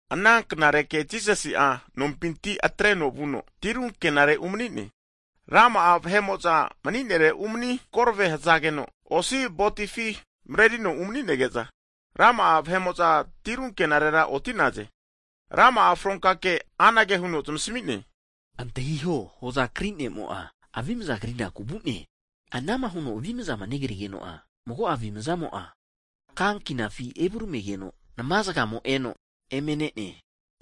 Ana knareke Jisasi'a nompinti atreno vuno, tiru ankenare umani'ne. Rama'a vahe'mo'za mni'nere umani korve hzageno, osi botifi mrerino umanige'za, rama'a vahe'mo'za tiru ankenare oti'naze. Rama'a fronka kea anage huno zmasmi'ne. Antahiho hoza kri ne'mo'a avimza krinaku vu'ne. Ana'ma huno avimzama negrigeno'a, mago'a avimzamo'a ka ankinafi evuramigeno, nma zgamo eno eme ne'ne.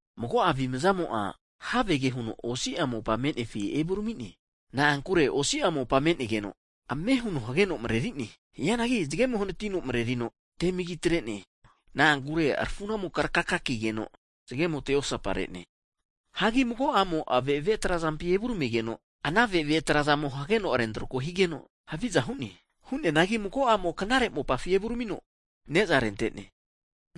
Mago'a avimzamo'a havege huno osi'a mopa me'nefi evurami'ne. Na'ankure osi'a mopa me'negeno, ame huno hageno mrerine. Hianagi zgemo hanatino mrerino temagi atre'ne, na'ankure rafu'namo krakaka kigeno, zgemo te osapare'ne. Hagi mago'amo ave'ave trazampi evurmigeno, ana ave'ave trazamo hageno rentrako higeno haviza hu'ne. Hu'neanagi mago'amo'a knare mopafi evurmino ne'za rente'ne.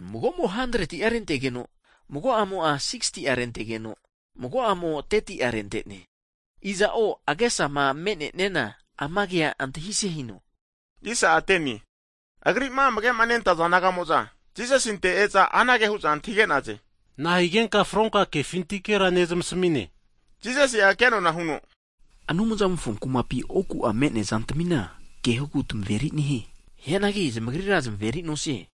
Mago'amo'a 100ti'a rentegeno, mago'amo'a 60ti'a rentegeno, mago'amo'a 30ti'a rente'ne. Iza'o agesama me'neniana, ama kea antahise hino. Agri'ma amage'ma nentaza disaipol nagamo'za Jisasinte e'za anage hu'za antahige'naze, nahigenka fronka kefintikera nezmasmi'ne? Jisasi'a ke nona huno, Anumzamofo kumapi oku'a me'nea zantmina kehogu tamaveri nehie. Hianagi zamagrira zmeri nosie.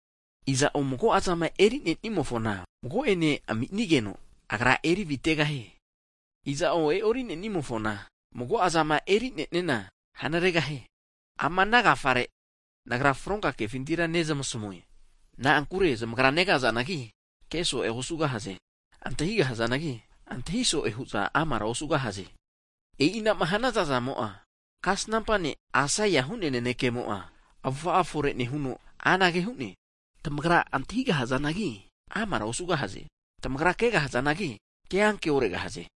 Iza'o mago'azama eri nenimofona, mago'ene ami'nigeno, agra eri avitegahie. Iza'o e'ori nenimofona, mago'a zama eri'neniana hanregahie. Ama'na agafare, Nagra fronka kefintira nezmasmue. Na'ankure zamagra negazanagi keso'e osugahaze, antahigahazanagi antahi so'e hu'za amara osugahaze. E'inama hu'naza'zamo'a kasnampa ne' Aisaia hu'nea nanekemo'a avufa'a fore nehuno anage hu'ne, Tamagra antahigahazanagi, amara osugahaze. Tamagra kegahazanagi, keanke oregahaze.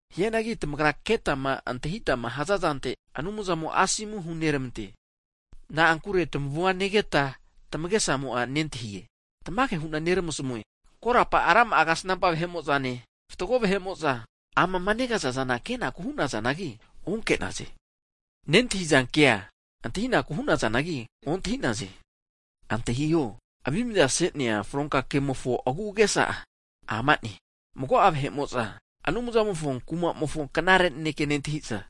Hianagi tamagra ketama antahitma hazazante Anumzamo asomu hunermante. Na'ankure tamavua negeta tamagesamo'a nentahie. Tamage hu'na neramasmue, korapa rama'a kasnampa vahe'mo'zane, fatgo vahe'mo'za amama negaza'za kenaku hu'nazanagi onke'za, nentahizankea, antahinaku hu'nazagi ontahi'naze. Antahiho, Avimza ase'nea fronka kemofo agu'agesa'a, ama'ne, Mago'a vahe'mo'za Anumzamofo kumamofo knare naneke nentahi'za,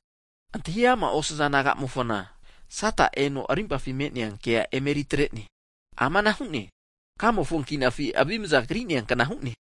antahi ama osaza nagamofona, Sata eno rimpafi me'nea ke emeri atre'ne. Amana hu'ne, kamofo ankinafi avimza kri'nea kna hu'ne.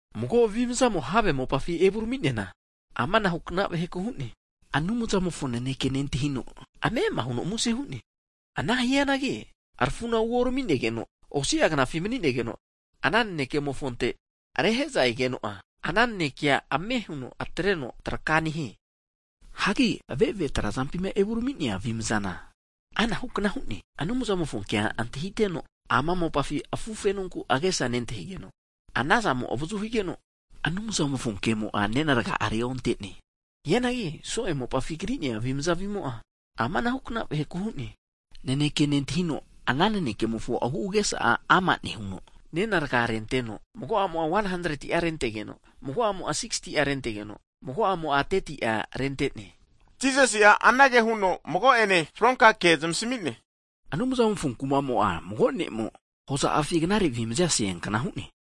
Mago avimazamo have mopafi evurami'neana, amanahu kna vaheku hu'noe. Anumzamofo naneke nentahino, ame'ama huno muse hu'ne. Ana hianagi rafu'na uorminegeno, osi'a knafi mni'negeno ana nanekemofonte rehe'za egeno'a, ana nanekea ame huno atreno traka nehie. Hagi ave'ave trazampi evu rmi'nea avimazana anahu kna hu'ne, Anumzamofo kea antahiteno, ama mopafi afufenoku agesa nentahigeno, ana zamo avazu higeno Anumzamofo kemo'a nena rga'a reonte'ne. Hianagi so'e mopafi kri'nea avimza avimo'a, amanahu vaheku hu'noe, naneke nentahino ana nanenkemofo agu'agesa'a ama nehuno, nena rga'a renteno mago'amo'a 100ti'a rentegeno, mago'amo 60ti'a rentegeno, mago'amo 30ti'a rente'ne. Jisasi'a anage huno mago'ene fronka ke zmasmi'ne, Anumzamofo kumamo'a mago ne'mo hoza'afi knare avimza aseankna hu'ne.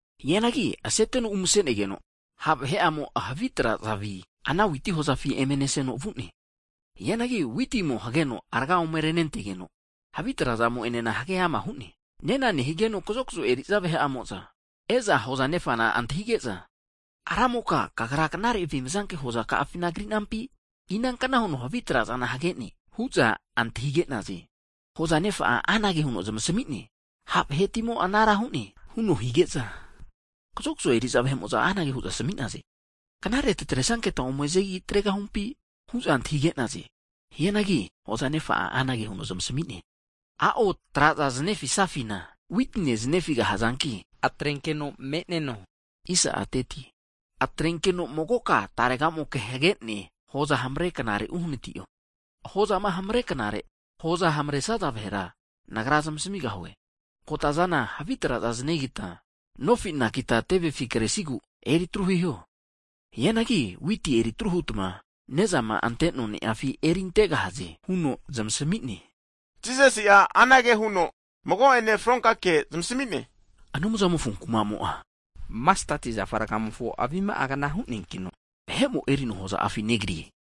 Hianagi avimaza aseteno umasenegeno, ha' vahe'amo havi traza'mofo avi ana witi hozafi eme neseno vu'ne. Hianagi witimo hageno rga ome renentegeno, havi trazamo enena hage ama hu'ne. Nena nehigeno kazokzo eri'za vahe'amo'za e'za, hoza nefana antahige'za, ramoka kagra knare avimzanke hoza ka'afina kri'nampi? Inankna huno havi trazana hage'ne? hu'za antahige'naze. Hoza nefa'a anage huno zmasmi'ne, Ha' vahetimo anara hu'ne! huno hige'za, kazokzo eri'za vahe'mo'za anage hu'za asmi'naze, knare tatresanketa ome zanegi atregahumpi? hu'za antahige'naze. Hianagi hoza nefa'a anage huno zmasmi'ne, A'o tra'za zanefisafina witine zanefigahazanki atrenkeno me'neno. Atrenkeno magoka tarega moke hage'ne hoza hamare knare uhnati'o, hozama hamareknare, hoza hamaresaza vahera nagra zamasmigahue. Kotazana havi traza zanegita nofi anakita tevefi kresigu eri atru hiho. Hianagi witi eri atru hutma nezama ante noni'afi eri antegahaze huno zmasami'ne. Jisasi'a anage huno mago'ene fronka ke zmasmi'ne, Anumzamofo kumamo'a masteti zafa rgamofo avima'agna hu'neankino, vahe'mo erino hoza'afi negrie.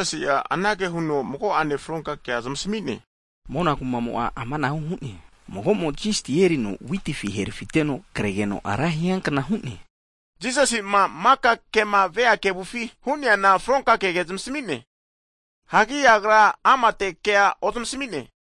Jisasi'a anage huno mago'ene fronka ke zmasmi'ne, mona kumamo'a amanahu hu'ne, mago'mo yisti erino witifi herafiteno kregeno ra hiankna hu'ne. Jisasi'ma maka kema vea kevufi hu'neana fronka kege zamasmi'ne. Hagi Agra amate kea ozmasmi'ne.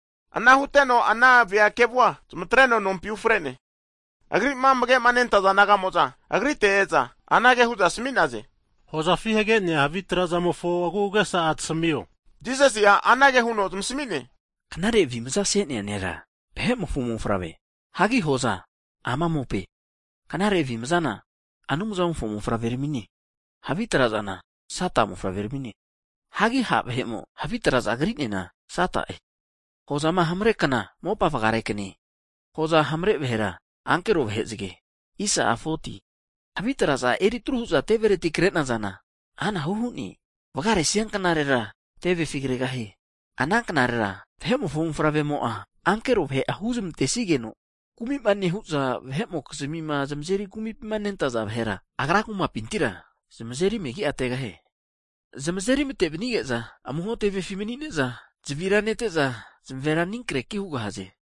Ana huteno ana vahe kevua, zmatreno nompi ufre'ne. Agri'ma amage'ma nentaza disaipol nagamo'za Agrite e'za, anage hu'za asmi'naze, hozafi hage'nea havi trazamofo agu'agesa'a tasmio. Jisasi'a anage huno zmasmi'ne, knare avimza ase'nea nera, Vahe'mofo Mofavre. Hagi hoza, ama mope, knare avimzana, Anumzamofo mofavrermine, havi trazana, Sata mofavreramine. Hagi ha' vahe'mo havi traza kri'neana Sata'e. Hozama hamre kna, mopa vgare kne, hoza hamare vahera, ankero vahezge. Havi traza eri tru hu'za tevereti kre'nazana anahu hu'ne, vgaresia knarera tevefi kregahie. Ana knarera Vahe'mofo mofavremo'a ankero vahe'a huzmantesigeno, kumi'ma nehu'za vahe'mokizmia zmazeri kumipima nentaza vahera, Agra'a kumapintira zmazeri megi atregahie. Zmazeri mate vnige'za amuho tevefi mni'ne'za zavira nete'za, zmavera ani kreki hugahaze.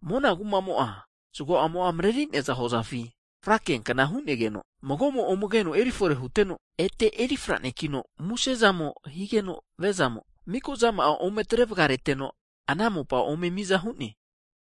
Mona kumamo'a, zgo'amo mreri'neaza hozafi frakiankna hu'negeno, mago'mo ome keno eri fore huteno, ete eri franekino, musezamo higeno viazamo miko zama'a zgore ome atre vgareteno, ana mopa ome mi'za hu'ne.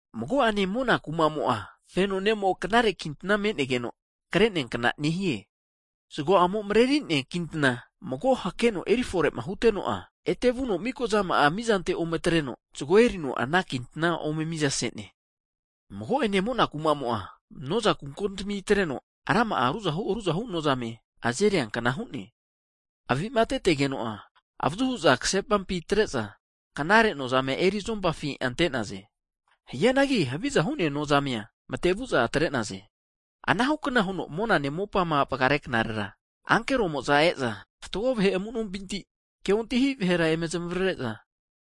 Mago'ene mona kumamo'a, feno ne'mo knare kintna me'negeno hakrea kna nehie. Zgo'amo mreri'nea kintna mago hakeno eri fore'ma huteno'a, ete vuno miko zama'a mizante ome atreno zgo erino, ana kintna ome mizase'ne. Mago'ene mona kumamo'a, noza kuko timpi atreno rama'a ruzahu ruzahu nozame azeriankna hu'ne. Hagi avi'matetegeno'a avazu hu'za ksepampi atre'za, knare nozame eri'za zompafi ante'naze. Hianagi havi'za hu'nea nozame'a matevu atre'naze. Anahu kna huno mona mopa vgare knarera ankeromo'za e'za fatgo vahe amu'nompinti ke ontahi vahera eme zmavare'za,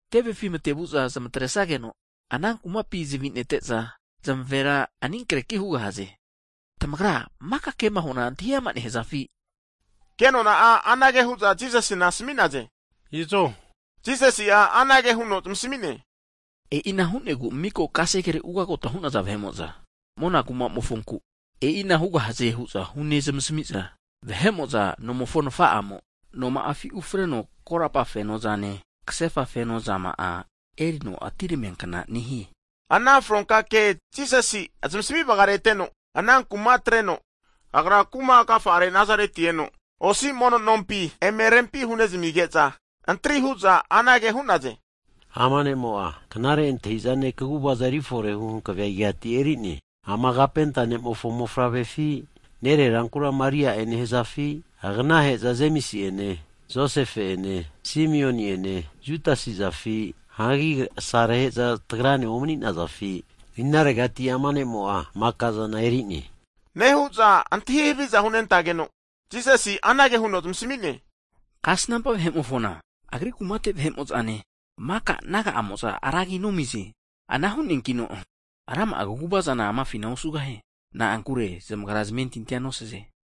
tevefi matevu'za zmatresigeno ana kumapina zavi nete'za, zmavera ani kreki hugahaze. Tamagra maka kema huana antahi ama nehazafi? Kenona'a anage hu'za Jisasina asmi'naze, izo. Jisasi'a anage huno zmasmi'ne, e'ina hu'negu miko kasegere ugagota hu'naza vahe'mo'za mona kumamofonku e'ina hugahaze hu'za hunezmasamiza vahe'mo'za, nomofo nafa'amo noma'afi ufreno korapa fenozane, ksefa fenozama'a erino atineramia kna nehie. Ana fronka kea Jisasi'a zamasmi vgareteno, ana kuma atreno, Agra kuma agafa'are Nazareti eno osi mono nompi eme rempi hunezmige'za, antri hu'za anage hu'naze, ama ne'mo'a knare antahi'zane, kaguvaza eriforehu hankavea igati erine? Ama kapenta ne'mofo mofavrefi? Nererankura Maria'e nehazafi? Agnahe'za Jemsi ene Josefe ene Simioni ene Judasizafi? Hagi asarahe'za tagrane omni'nazafi? Inaregati ama ne'mo'a maka'zana eri'ne. Nehu'za antahi haviza hunentageno, Jisasi anage huno zmasmi'ne, kasnampa vahe'mofona Agri kumate vahe'mo'zane, maka naga amo'za ra agi nomize. Ana hu'neankino rama'a kaguvazana amafina osugahie. Na'ankure zmagra zamentintia nosaze.